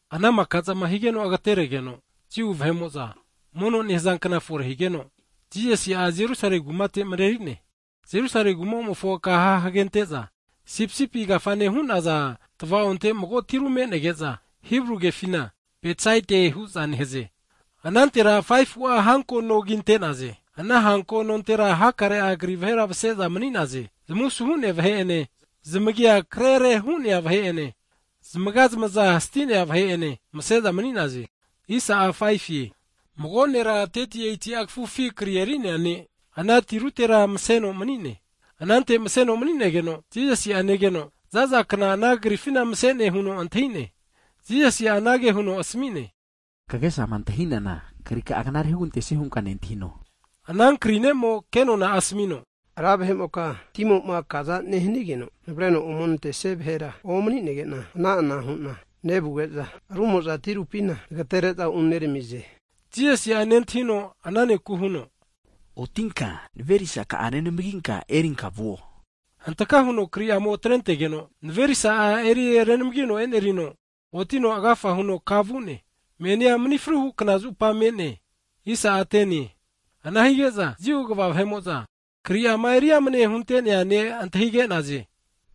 Ana maka'zama higeno agteretegeno, Jiu vahe'mo'za mono nehza kna fore higeno, Jisasi'a Jerusale kumate mreri'ne. Jerusale kuma'mofo kaha hagente'za, Sipisipi Kafane hu'naza tvaonte mago tiru me'nege'za, Hibru kefina Betsaida hu'za nehaze. Anantera 5fu'a hanko no kinte'naze. Ana hanko nontera hakare'a kri vahera mse'za mani'naze, zamusuhu vahe'ene zamagia krere hu'nea vahe'ene zamaga zamaza sti'nea vahe'ene mani'naze. Mago nera 38ti'a kafufi kri eri'nea ne', ana tirutera mseno mani'ne. Anante mseno mani'negeno Jisasi'a negeno, za'za kna ana krifina mse'ne huno antahi'ne. Jisasi'a anage huno asmi'ne, Kagesama antahinana krika'a knare hugantesie hunka nentahino? Ana kri ne'mo kenona'a asmino, Ra vahe'moka timoma kazama nehanigeno navreno ome nantesia vahera omni'nege'na, ana'ana hu'na nevuge'za rumo'za tirupina nagtere'za unermize. Jisasi'a nentahino ana neku huno, Otinka, naverisaka'a renamginka e'nerinka vuo. Hantaka huno kri'amo atrentegeno, tafe'a erirenamgino e'nerino otino agafa huno kana vu'ne. Ana kna mni fruhu kna (Sabat) zupa ana kaguvazana hu'ne. Ana hige'za Jiu kva vahe'mo'za kri'ama eri amne huntea ne' antahige'naze,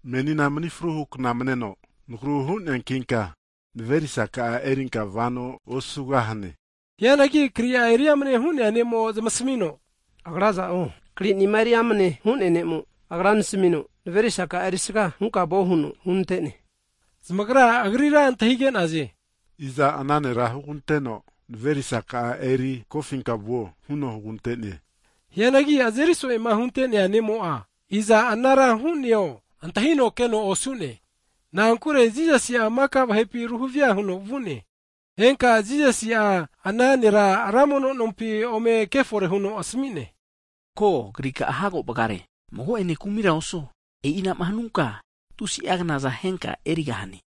menina mni fruhu (Sabat) kna meno nagru hu'neankinka, naverisaka'a erinka vano osu'gahane. Hianagi kri'a eri amne hu'nea ne'mo zamasmi'ne, agra aza'o kri'nima eri amne hu'nea ne'mo Agra nasmino, naverisaka'a erisaga hunka vuo huno hunante'ne. Zamagra, agrira antahige'naze, Iza ana nera huganteno, naverisaka'a eri kofinka vuo huno hugante'ne? Hianagi azeri so'ema hunte'nea ne'mo'a, iza anara hu'neo antahino keno osu'ne, na'ankure Jisasi'a maka vahepi ruhavia huno vu'ne. Henka Jisasi'a ana nera ra mono nompi ome kefore huno asmi'ne, ko, krika'a hago vgare, mago'ene kumira osuo, e'inama hanunka tusi'a knaza henka'a erigahane.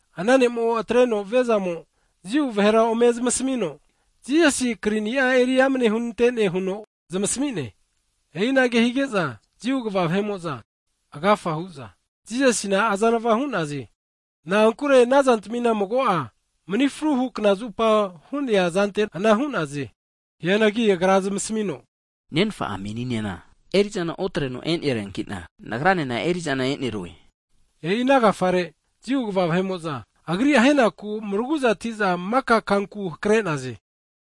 Ana ne'mo'a atreno viazamo, Jiu vahera ome zamasmino, Jisasi kri'nia eri amane hunante'ne huno zamasmi'ne. E'inage hige'za, Jiu kva vahe'mo'za agafa hu'za Jisasina azanva hu'naze, na'ankure ana zantmina mago'a, mni fruhu kna (Sabat) zupa hu'nea zante ana hu'naze. Hianagi Agra zamasmino, Nenfa'a meninena eri'zana otreno e'neriankina, Nagra'nena eri'zana enerue. E'i ana agafare, Jiu kva vahe'mo'za Agri ahenaku mraguza'ati'za maka kanku hakre'naze.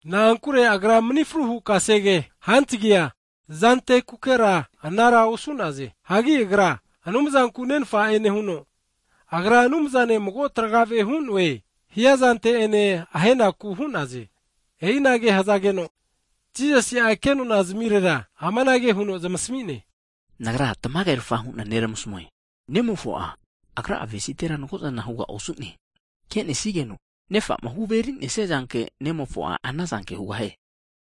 Na'ankure Agra mni fruhu kasege hantagia zantekukera ana osu'naze. Hagi Agra Anumzanku Nenfa'e nehuno, Agra Anumzane mago tragave hu'noe, hia zante'ene ahenaku hu'naze. E'inage hzageno Jisasi kenona zmirera amanage huno zamasmi'ne, Nagra tamagerafa hu'na neramasmue, Nemofo'a Agra'a avesitera mago'zana hugaosu'neankino, ke'nesigeno Nefa'ma huveri'nesia zanke, Nemofo'a anazanke hugahie.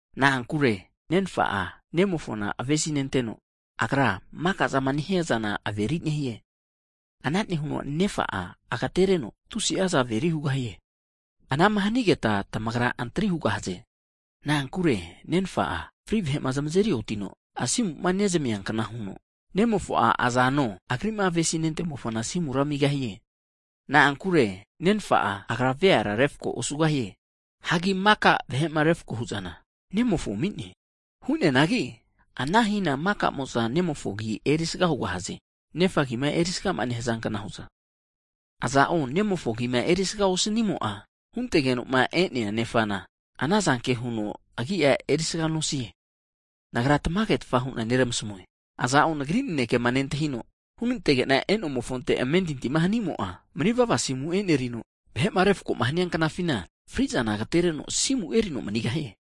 Na'ankure Nenfa'a, Nemofona avesinenteno, Agra maka'zama nehia zana averi nehie. Ana nehuno Nefa'a agtereno tusi'aza averi hugahie. Anama hanigeta tamagra antri hugahaze. Na'ankure Nenfa'a fri' vahe'ma zamazeri otino, asimu nezmia kna huno, Nemofo'a azano, Agri'ma avesi'nimofona asimura amigahie. Na'ankure Nenfa'a Agra veara refko osugahie. Hagi maka vahe'ma refko hu'zana, Nemofo ami'ne. Ana hina maka'mo'za Nemofo agi'a erisaga hugahaze. Nefa agima erisaga nehza kna hu'za, aza'o Nemofo agima erisaga osnimo'a, huntegeno'ma e'nea Nefana, anazanke huno agi'a erisaga nosie. Nagra tamage hu'na neramasmue, aza'o Nagri nanekema nentahino hunantege'na e'nomofonte amentinti hanimo'a, manivava asimu enerino, vahe'ma refko hania knafina, fri'zana agtereno asimu erino manigahie.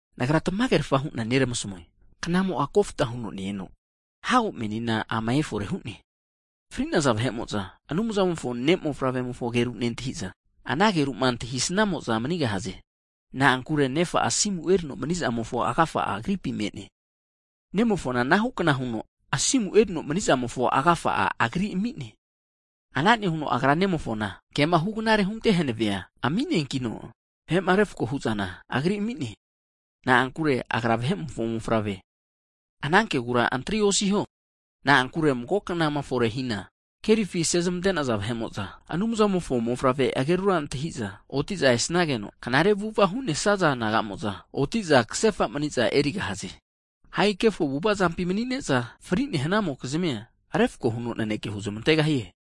Nagra tamage hu'na neramasmue, knamo'a kofta huno ne-eno hago menina ama efore hu'ne, fri'naza vahe'mo'za Anumzamofo Ne' mofavremofo ageru nentahi'za, ana ageru'ma antahisnamo'za manigahaze. Na'ankure Nefa'a asimu erino mani'zamofo agafa'a Agripi me'ne. Nemofona anahu kna huno asimu erino mani'zamofo agafa'a Agri ami'ne. Ana nehuno Agra Nemofona kema hugnare hunte hanavea (atoriti) ami'neankino, vahe'ma refko hu'zana Agri ami'ne, na'ankure Agra Vahe'mofo Mofavre. Ana kegura antria osiho, na'ankure mago knama fore'ma hina kerifi asezamante'naza vahe'mo'za Anumzamofo Mofavre'agerura antahi'za, oti'za esnageno knare avu'ava hu'nesaza nagamo'za, oti'za ksefa mani'za erigahaze. Hagi kefo avu'avazampi mani'ne'za fri'ne hanamokizmia, refako huno naneke huzmantegahie.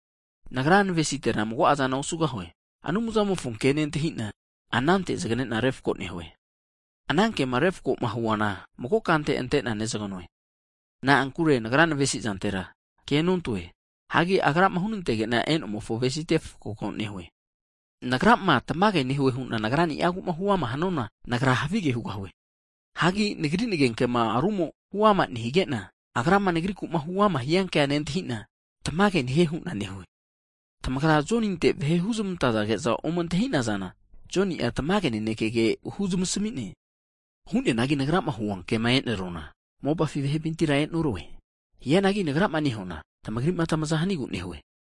Nagra navesitera mago'azana osugahue. Anumzamofo ke nentahi'na anante zganena refko nehue. Ana kema refko'ma huana mago kante ante'na nezganoe. Na'ankure Nagra navesi'zantera kenontoe, hagi Agrama hunantege'na e'nomofo avesite refkoa nehue. Nagrama, tamage nehue hu'na Nagrani'agu huama hanuana, Nagra havige hugahue. Hianagi Nagri nagenkema rumo huama (testimoni) nehige'na, Agrama Nagriku huama hianke nentahi'na, tamage nehie hu'na nehue. Tamagra Joninte vahe huzmantage'za ome antahi'nazana, Joni'a tamage nanekege huzmasmi'ne. Hu'neanagi Nagrama hua kema e'neruana, mopafi vahepintira e'norue. Hianagi Nagrama nehuana tmagri'ma tmaza hanigu nehue.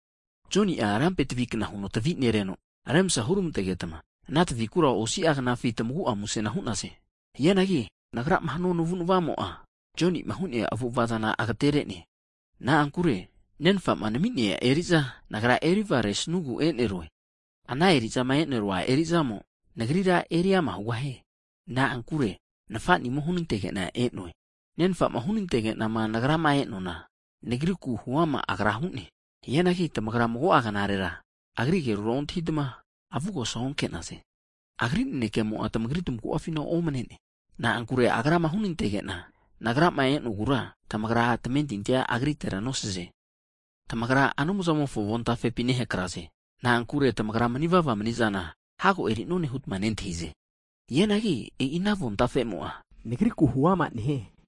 Joni'a lampe tvi kna huno tvi'nereno remsa hurmantegeta, ana tvi'kura osasi'a knafi tmagu'a musena hu'naze. Hianagi Nagrama hanua navu'navamo'a, Joni'ma hu'nea avu'avazana agtere'ne. Na'ankure Nenfa'ma nami'nea eri'za Nagra eri vgaresnugu e'nerue, ana eri'zama e'nerua eri'zamo, Nagrira eriama hugahie, na'ankure Nfa'nimo hunantege'na e'noe. Nenfa'ma hunantege'na Nagrama e'noana, Nagriku huama Agra hu'ne. Hianagi tamagra mago'a knarera Agri agerura ontahitma, avugosa onke'naze. Agri nanekemo'a tamagri tamagu'afina omne'ne, na'ankure Agrama hunantege'na Nagrama e'nogura, tamagra tamentintia Agritera nosaze. Tamagra Anumzamofo avontafepi nehakraze, na'ankure tamagra mani'vava mani'zana hago eri'none hutma nentahize. Hianagi e'i ana avontafemo'a Nagriku huama nehie.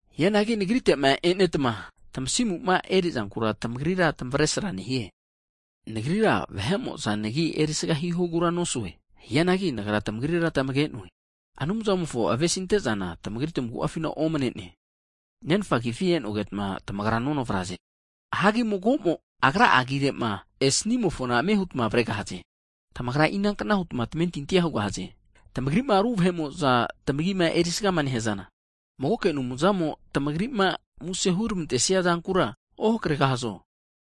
Hianagi Nagrite'ma e'netma tmasimu eri'zankura tamagrira tamavesra nehie. Nagrira vahe'mo'za nagi erisaga (glori) hihogura nosue. Hianagi Nagra tamagrira tamage'noe, Anumzamofo avesinte'zana tamagri tamagu'afina omne'ne. Nagra, Nenfa agifi e'nogeta tamagra nonavraze, hagi mago'mo agra agire'ma esnimofona ame huta avregahaze. Tamagra inankna huta tamentintia hugahaze, tamagri'ma ru vahe'mo'za tmagima erisaga nehazana, magoke Anumzamo tmagri'ma muse hurmante'sia zankura ohakre'gahazo?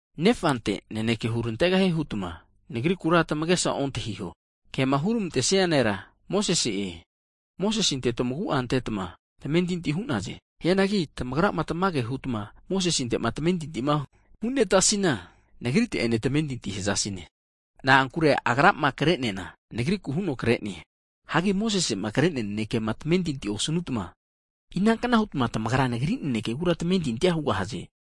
Nefante naneke hurantegahie hutma Nagrikura tamagesa ontahiho, kema hurmantesia nera Mosese'e, Mosesete tamagu'a antetma tamentintina hu'naze. Hianagi tamagrama tamage hutma Mosesente'ma tamentinti hunetasina, Nagrite ene tamentinti hazasine, na'ankure agrama kre'neana, Nagriku huno kre'ne. Hianagi Mosesema kre'nea nanekema tamentinti osnutma, inankna huta tamagra Nagri nanekegura tamentintia hugahaze?